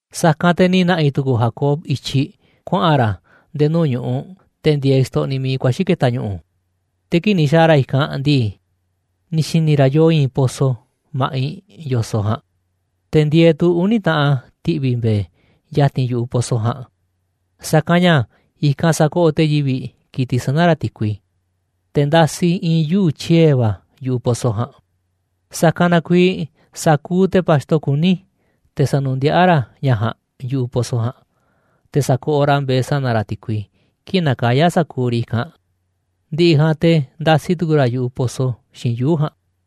Sa̱kanꞌ te̱ ni̱ na̱ꞌi̱ tu̱ku̱u̱ Jacob i̱tyiꞌ kuaꞌa̱n ra̱ nde̱e̱ nuu̱ꞌ ñu̱ꞌuꞌ te̱ ndieeꞌ xtoꞌniꞌ miiꞌ kuaxi̱ ke̱ta̱ ñu̱ꞌu̱. Te̱ kii̱ꞌ ni̱ xa̱a̱ ra̱ i̱kanꞌ ndii, ni̱ xi̱ni̱ ra̱ yoo i̱i̱n pozo ma̱ꞌiꞌ yo̱soꞌ ja̱a̱nꞌ, te̱ ndieeꞌ tu̱ uni̱ taꞌan ti̱ꞌvi̱ mbe̱e̱ ya̱ti̱n yu̱ꞌuꞌ pozo ja̱a̱nꞌ, sa̱kanꞌ ña̱ i̱kanꞌ sakoꞌoꞌ te̱ yivi̱ꞌ ki̱tiꞌ sana̱ ra̱ ti̱kui, te̱ ndasi i̱i̱n yuu̱ꞌ tyie̱ va̱ yu̱ꞌuꞌ pozo ja̱a̱nꞌ. Sa̱kanꞌ na kuiiꞌ sa̱kuuꞌ te̱ pa̱xto kuní, te̱ sa̱nu̱ndiaꞌá ra̱ ña̱ ja̱a̱nꞌ yu̱ꞌuꞌ pozo ja̱a̱nꞌ, te̱ sa̱koꞌoꞌ ra̱ mbe̱e̱ sana̱ ra̱ ti̱kui kii̱ꞌ nakayá sa̱kuuꞌ riꞌ i̱kanꞌ, ndi̱ꞌi̱ ja̱a̱nꞌ te̱ ndasi tu̱ku̱u̱ ra̱ yu̱ꞌuꞌ pozo xiinꞌ yuu̱ꞌ ja̱a̱nꞌ.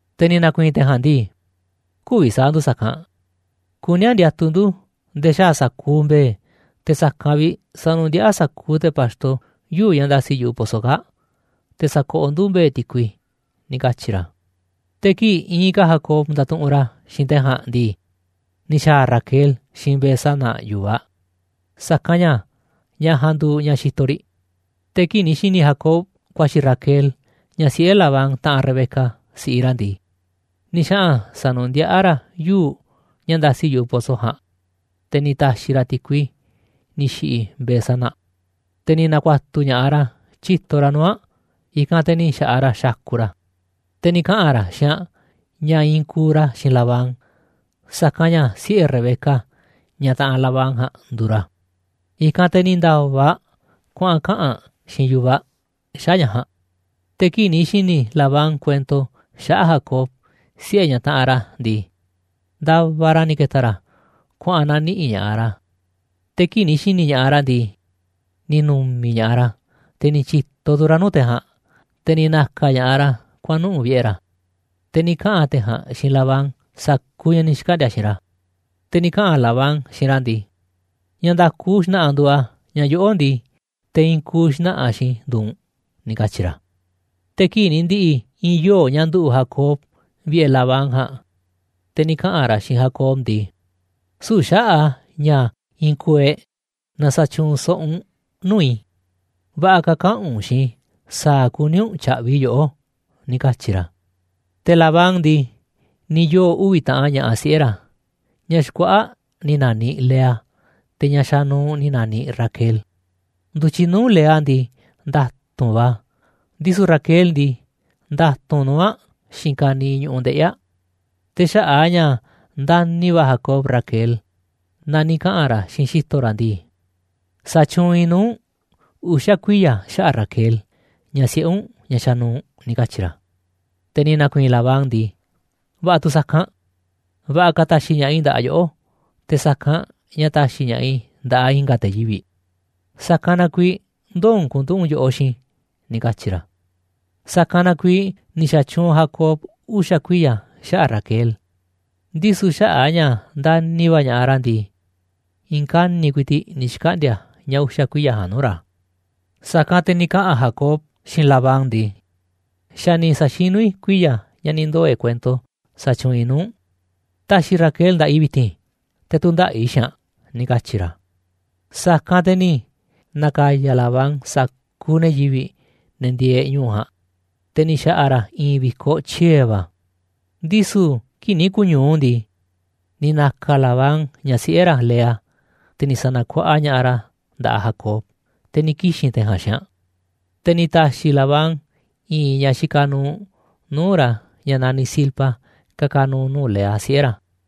Te̱ ni̱ na̱ku̱i̱i̱n te̱ ja̱a̱nꞌ ndii: ―Kü̱vi̱ sa̱a̱ ndu̱ sa̱kanꞌ, kuní a̱ ndiatuꞌ ndu̱ nde̱e̱ xaa̱ sa̱kuuꞌ mbe̱e̱, te̱ sa̱kanꞌ vi̱ꞌ sa̱nu̱ndiaꞌá sa̱kuuꞌ te̱ pa̱xto yuu̱ꞌ ña̱ ndasi yu̱ꞌuꞌ pozo kaa̱ꞌ, te̱ sa̱koꞌoꞌ ndu̱ mbe̱e̱ ti̱kui ―ni̱ katyi̱ ra̱. Te̱ kii̱ꞌ iinꞌ ka̱ Jacob ndatuꞌunꞌ ra̱ xiinꞌ te̱ ja̱a̱nꞌ ndii, ni̱ xa̱a̱ Raquel xiinꞌ mbe̱e̱ sana̱ yu̱vaꞌ aꞌ, sa̱kanꞌ ña̱ ñaꞌ ja̱a̱nꞌ nduuꞌ ñaꞌ xitoꞌ riꞌ. Te̱ kii̱ꞌ ni̱ xi̱ni̱ Jacob kuaxi̱ Raquel, ñaꞌ siꞌe̱ Labán taꞌanꞌ Rebeca, si̱ꞌiꞌ ra̱ ndii, ni̱ xaꞌa̱n sa̱nu̱ndiꞌá ra̱ yuu̱ꞌ ña̱ ndasi yu̱ꞌuꞌ pozo ja̱a̱nꞌ, te̱ ni̱ ta̱xi̱ ra̱ ti̱kui ni̱ xi̱ꞌi̱ mbe̱e̱ sana̱ aꞌ. Te̱ ni̱ na̱ku̱a̱tu̱ ña̱ꞌaꞌ ra̱ tyíto ra̱ nuu̱ꞌ aꞌ, i̱kanꞌ te̱ ni̱ xa̱ꞌaꞌ ra̱ xakuꞌ ra̱. Te̱ ni̱ kaꞌa̱n ra̱ xiinꞌ aꞌ ña̱ i̱i̱n kuuꞌ ra̱ xiinꞌ Labán, sa̱kanꞌ ña̱ siꞌe̱ Rebeca, ñaꞌ taꞌanꞌ Labán ja̱a̱nꞌ, nduuꞌ ra̱. I̱kanꞌ te̱ ni̱ nda̱va̱ aꞌ kuaꞌa̱n kaꞌa̱n aꞌ xiinꞌ yu̱vaꞌ aꞌ xaꞌa̱ꞌ ña̱ ja̱a̱nꞌ. Te̱ kii̱ꞌ ni̱ xi̱ni̱ Labán kuento xaꞌa̱ꞌ Jacob, siꞌe̱ ñaꞌ taꞌanꞌ ra̱ ndii, ndavaꞌ ra̱ ni̱ ke̱ta̱ ra̱ kuaꞌa̱n na̱niꞌi̱ꞌ ña̱ꞌaꞌ ra̱, te̱ kii̱ꞌ ni̱ xi̱ni̱ ña̱ꞌaꞌ ra̱ ndii, ni̱ nu̱mi̱ ña̱ꞌaꞌ ra̱, te̱ ni̱ tyi̱to tu̱ ra̱ nuu̱ꞌ te̱ ja̱a̱nꞌ, te̱ ni̱ na̱ka̱ ña̱ꞌaꞌ ra̱ kuaꞌa̱n nuꞌu̱ꞌ vi̱ꞌe̱ ra̱, te̱ ni̱ kaꞌa̱n te̱ ja̱a̱nꞌ xiinꞌ Labán sa̱kuuꞌ ña̱ ni̱ xkaꞌndi̱a̱ xiinꞌ ra̱. Te̱ ni̱ kaꞌa̱n Labán xiinꞌ ra̱ ndii: ―Ña̱ nda̱ku xna̱ꞌa̱ nduuꞌ a̱ ña̱ yoꞌó ndii, te̱ i̱i̱n kuuꞌ xna̱ꞌa̱ xiinꞌ i̱ nduuꞌ u̱nꞌ ―ni̱ katyi̱ ra̱. Te̱ kii̱ꞌ ni̱ ndi̱ꞌi̱ i̱i̱n yoo̱ꞌ ña̱ nduꞌu̱ꞌ Jacob vi̱ꞌe̱ Labán ja̱a̱nꞌ, te̱ ni̱ kaꞌa̱n ra̱ xiinꞌ Jacob ndii: ―Süu̱ꞌ xaꞌa̱ꞌ a̱ ña̱ i̱i̱n kuuꞌ e̱ꞌ na sa̱tyuunꞌ so̱ꞌo̱ u̱nꞌ nuu̱ꞌ i̱. Va̱ꞌa̱ ka̱ kaꞌa̱n u̱nꞌ xiinꞌ i̱ sa̱a̱ kuní u̱nꞌ tya̱ꞌvi̱ i̱ yoꞌó ―ni̱ katyi̱ ra̱. Te̱ Labán ndii, ni̱ yoo̱ uvi̱ taꞌan ña̱ꞌaꞌ siꞌe̱ ra̱, ñaꞌ xkuaꞌa̱ꞌ ni̱ na̱niꞌ Lea, te̱ ñaꞌ xanuuꞌ ni̱ na̱niꞌ Raquel. Ndu̱tyiꞌ nuu̱ꞌ Lea ndii, nda̱tu̱nꞌ va̱ a̱, ndisu̱ Raquel ndii, nda̱tu̱nꞌ nuu̱ꞌ aꞌ xiinꞌ ka̱niiꞌ ñu̱ꞌuꞌ ndeꞌi̱ aꞌ. Te̱ xaꞌa̱ꞌ a̱ ña̱ ndani̱ va̱ Jacob Raquel, na ni̱ kaꞌa̱n ra̱ xiinꞌ xi̱to̱ ra̱ ndii: ―Sa̱tyuunꞌ i̱ nuu̱ꞌ u̱nꞌ uxa̱ kuiya̱ xaꞌa̱ꞌ Raquel, ñaꞌ siꞌe̱ u̱nꞌ, ñaꞌ xanuuꞌ ―ni̱ katyi̱ ra̱. Te̱ ni̱ na̱ku̱i̱i̱n Labán ndii: ―Va̱ꞌa̱ tu̱ sa̱kanꞌ, va̱ꞌa̱ ka̱ ta̱xi̱ ña̱ꞌaꞌ i̱ nda̱ꞌaꞌ yoꞌó, te̱ sa̱kanꞌ ña̱ ta̱xi̱ ña̱ꞌaꞌ i̱ nda̱ꞌaꞌ i̱nga̱ te̱ yivi̱ꞌ, sa̱kanꞌ na kuiiꞌ ndoo̱ u̱nꞌ ku̱nduꞌu̱ꞌ u̱nꞌ yoꞌoꞌ xiinꞌ i̱ ―ni̱ katyi̱ ra̱. Sa̱kanꞌ na kuiiꞌ ni̱ xa̱tyuunꞌ Jacob uxa̱ kuiya̱ xaꞌa̱ꞌ Raquel, ndisu̱ xaꞌa̱ꞌ a̱ ña̱ ndani̱ va̱ ña̱ꞌaꞌ ra̱ ndii, i̱i̱n kani̱ꞌ ku̱i̱ti̱ꞌ ni̱ xkaꞌndi̱a̱ ña̱ uxa̱ kuiya̱ ja̱a̱nꞌ nuu̱ꞌ ra̱. Sa̱kanꞌ te̱ ni̱ kaꞌa̱n Jacob xiinꞌ Labán ndii: ―Xa̱ ni̱ sa̱xinú i̱ kuiya̱ ña̱ ni̱ ndoo̱ e̱ꞌ kuento sa̱tyuunꞌ i̱ nuu̱ꞌ u̱nꞌ. Ta̱xi̱ Raquel nda̱ꞌaꞌ i̱ vi̱ti̱n, te̱ tu̱ndaꞌa̱ꞌ i̱ xiinꞌ aꞌ ―ni̱ katyi̱ ra̱. Sa̱kanꞌ te̱ ni̱ na̱ka̱ya̱ Labán sa̱kuuꞌ ne̱ yivi̱ꞌ, ne̱ ndieeꞌ ñu̱u̱ ja̱a̱nꞌ, te̱ ni̱ xa̱ꞌa̱ ra̱ i̱i̱n vi̱koꞌ tyie̱ va̱. Ndisu̱ kii̱ꞌ ni̱ ku̱ñu̱u ndii, ni̱ na̱ka̱ Labán ñaꞌ siꞌe̱ ra̱ Lea, te̱ ni̱ sa̱na̱kuaꞌa ña̱ꞌaꞌ ra̱ nda̱ꞌaꞌ Jacob, te̱ ni̱ kixi̱n te̱ ja̱a̱nꞌ xiinꞌ aꞌ. Te̱ ni̱ ta̱xi̱ Labán i̱i̱n ñaꞌ xikaꞌ nuuꞌ nuu̱ꞌ ra̱ ñaꞌ naniꞌ Zilpa ka̱ka̱ nu̱u̱ nuu̱ꞌ Lea, siꞌe̱ ra̱.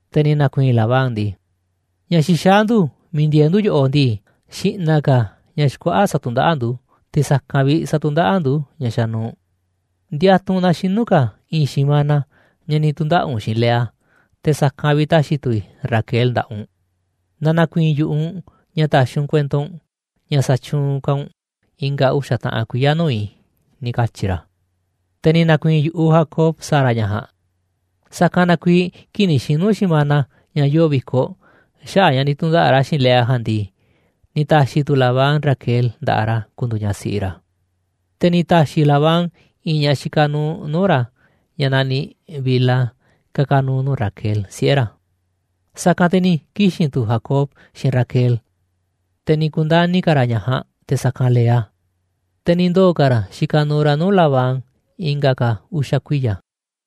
Te̱ ni̱ na̱ku̱i̱i̱n Labán ndii: ―Ña̱ xixaá ndu̱ miiꞌ ndieeꞌ ndu̱ yoꞌoꞌ ndii, xi̱ꞌna̱ ka̱ ñaꞌ xkuaꞌa̱ꞌ satundaꞌáꞌ ndu̱, te̱ sa̱kanꞌ vi̱ꞌ satundaꞌáꞌ ndu̱ ñaꞌ xanuuꞌ. Ndiatuꞌ u̱nꞌ na xinu̱ ka̱ i̱i̱n xi̱mana ña̱ ni̱ tu̱ndaꞌa̱ꞌ u̱nꞌ xiinꞌ Lea, te̱ sa̱kanꞌ vi̱ꞌ ta̱xi̱ tu̱ i̱ Raquel nda̱ꞌaꞌ u̱nꞌ, naaꞌ na̱ku̱i̱i̱n yu̱ꞌuꞌ u̱nꞌ ña̱ ta̱xi̱ u̱nꞌ kuento u̱nꞌ ña̱ sa̱tyuunꞌ ka̱ u̱nꞌ i̱nga̱ uxa̱ taꞌan kuiya̱ nuu̱ꞌ i̱ ―ni̱ katyi̱ ra̱. Te̱ ni̱ na̱ku̱i̱i̱n yu̱ꞌuꞌ Jacob sa̱a̱ ra̱ ña̱ ja̱a̱nꞌ, sa̱kanꞌ na kuiiꞌ kii̱ꞌ ni̱ xinu̱ xi̱mana ña̱ yoo vi̱koꞌ xaꞌa̱ꞌ ña̱ ni̱ tu̱ndaꞌa̱ꞌ ra̱ xiinꞌ Lea ja̱a̱nꞌ ndii, ni̱ ta̱xi̱ tu̱ Labán Raquel nda̱ꞌaꞌ ra̱ ku̱ndu̱u̱ ñaꞌ siꞌi ra̱. Te̱ ni̱ ta̱xi̱ Labán i̱i̱n ñaꞌ xikaꞌ nuuꞌ nuu̱ꞌ ra̱, ñaꞌ naniꞌ Bilha ka̱ka̱ nu̱u̱ nuu̱ꞌ Raquel, siꞌe̱ ra̱. Sa̱kanꞌ te̱ ni̱ kixi̱n tu̱ Jacob xiinꞌ Raquel, te̱ ni̱ ku̱ndani̱ ka̱ ra̱ ñaꞌ ja̱a̱nꞌ te̱ sa̱kanꞌ Lea, te̱ ni̱ ndoo̱ ka̱ ra̱ xikaꞌ nuuꞌ ra̱ nuu̱ꞌ Labán i̱nga̱ ka̱ uxa̱ kuiya̱.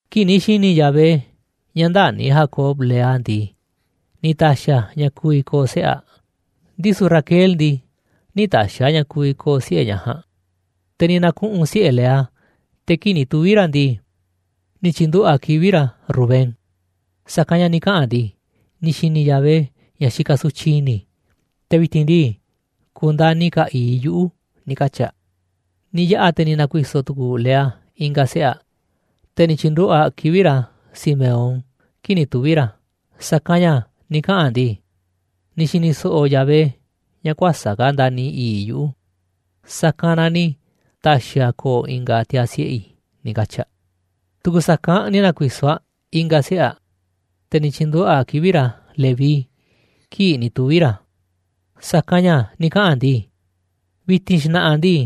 Kii̱ꞌ ni̱ xi̱ni̱ Yahvé ña̱ ndäni̱ Jacob Lea ndii, ni̱ ta̱xi̱ a̱ ña̱ ku̱vi̱ ko̱o̱ siꞌe̱ aꞌ, ndisu̱ Raquel ndii, nï̱ ta̱xi̱ a̱ ña̱ ku̱vi̱ ko̱o̱ siꞌe̱ ñaꞌ ja̱a̱nꞌ. Te̱ ni̱ na̱kuꞌu̱n siꞌe̱ Lea, te̱ kii̱ꞌ ni̱ tuvi̱ ra̱ ndii, ni̱ tyi̱nduꞌu̱ꞌ aꞌ kivi̱ꞌ ra̱ Rubén, sa̱kanꞌ ña̱ ni̱ kaꞌa̱n aꞌ ndii: «Ni̱ xi̱ni̱ Yahvé ña̱ xikaꞌ sutyiꞌ i̱ni̱ i̱, te̱ vi̱ti̱n ndii, ku̱ndani̱ ka̱ i̱i̱ꞌ i̱ yuꞌu̱», ni̱ katyi̱ aꞌ. Ni̱ yaꞌa̱ te̱ ni̱ na̱ku̱i̱so̱ tu̱ku̱u̱ Lea i̱nga̱ siꞌe̱ aꞌ, te̱ ni̱ tyi̱nduꞌu̱ꞌ aꞌ kivi̱ꞌ ra̱ Simeón kii̱ꞌ ni̱ tuvi̱ ra̱, sa̱kanꞌ ña̱ ni̱ kaꞌa̱n aꞌ ndii: «Ni̱ xi̱ni̱ so̱ꞌo̱ Yahvé ña̱ kuäsa̱ꞌ ka̱ ndani̱ i̱i̱ꞌ i̱ yuꞌu̱, sa̱kanꞌ na ni̱ ta̱xi̱ a̱ ko̱o̱ i̱nga̱ tiaa̱ siꞌe̱ i̱», ni̱ katyi̱ aꞌ. Tu̱ku̱ sa̱kanꞌ ni̱ na̱ku̱i̱so̱ aꞌ i̱nga̱ siꞌe̱ aꞌ, te̱ ni̱ tyi̱nduꞌu̱ꞌ aꞌ kivi̱ꞌ ra̱ Leví kii̱ꞌ ni̱ tuvi̱ ra̱, sa̱kanꞌ ña̱ ni̱ kaꞌa̱n aꞌ ndii: «Vi̱ti̱n xna̱ꞌa̱ ndii,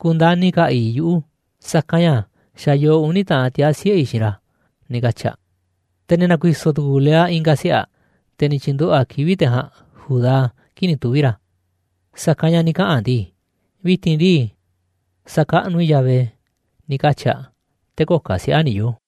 ku̱ndani̱ ka̱ i̱i̱ꞌ i̱ yuꞌu̱, sa̱kanꞌ ña̱ xa̱ yoo uni̱ taꞌan tiaa̱ siꞌe̱ i̱ xiinꞌ ra̱», ni̱ katyi̱ aꞌ. Te̱ ni̱ na̱ku̱i̱so̱ tu̱ku̱u̱ Lea i̱nga̱ siꞌe̱ aꞌ, te̱ ni̱ tyi̱nduꞌu̱ꞌ aꞌ kivi̱ꞌ te̱ ja̱a̱nꞌ Judá kii̱ꞌ ni̱ tuvi̱ ra̱, sa̱kanꞌ ña̱ ni̱ kaꞌa̱n aꞌ ndii: «Vi̱ti̱n ndii, sa̱kaꞌnuꞌ i̱ Yahvé», ni̱ katyi̱ aꞌ. Te̱ köo̱ꞌ ka̱ siꞌe̱ aꞌ ni̱ yoo̱.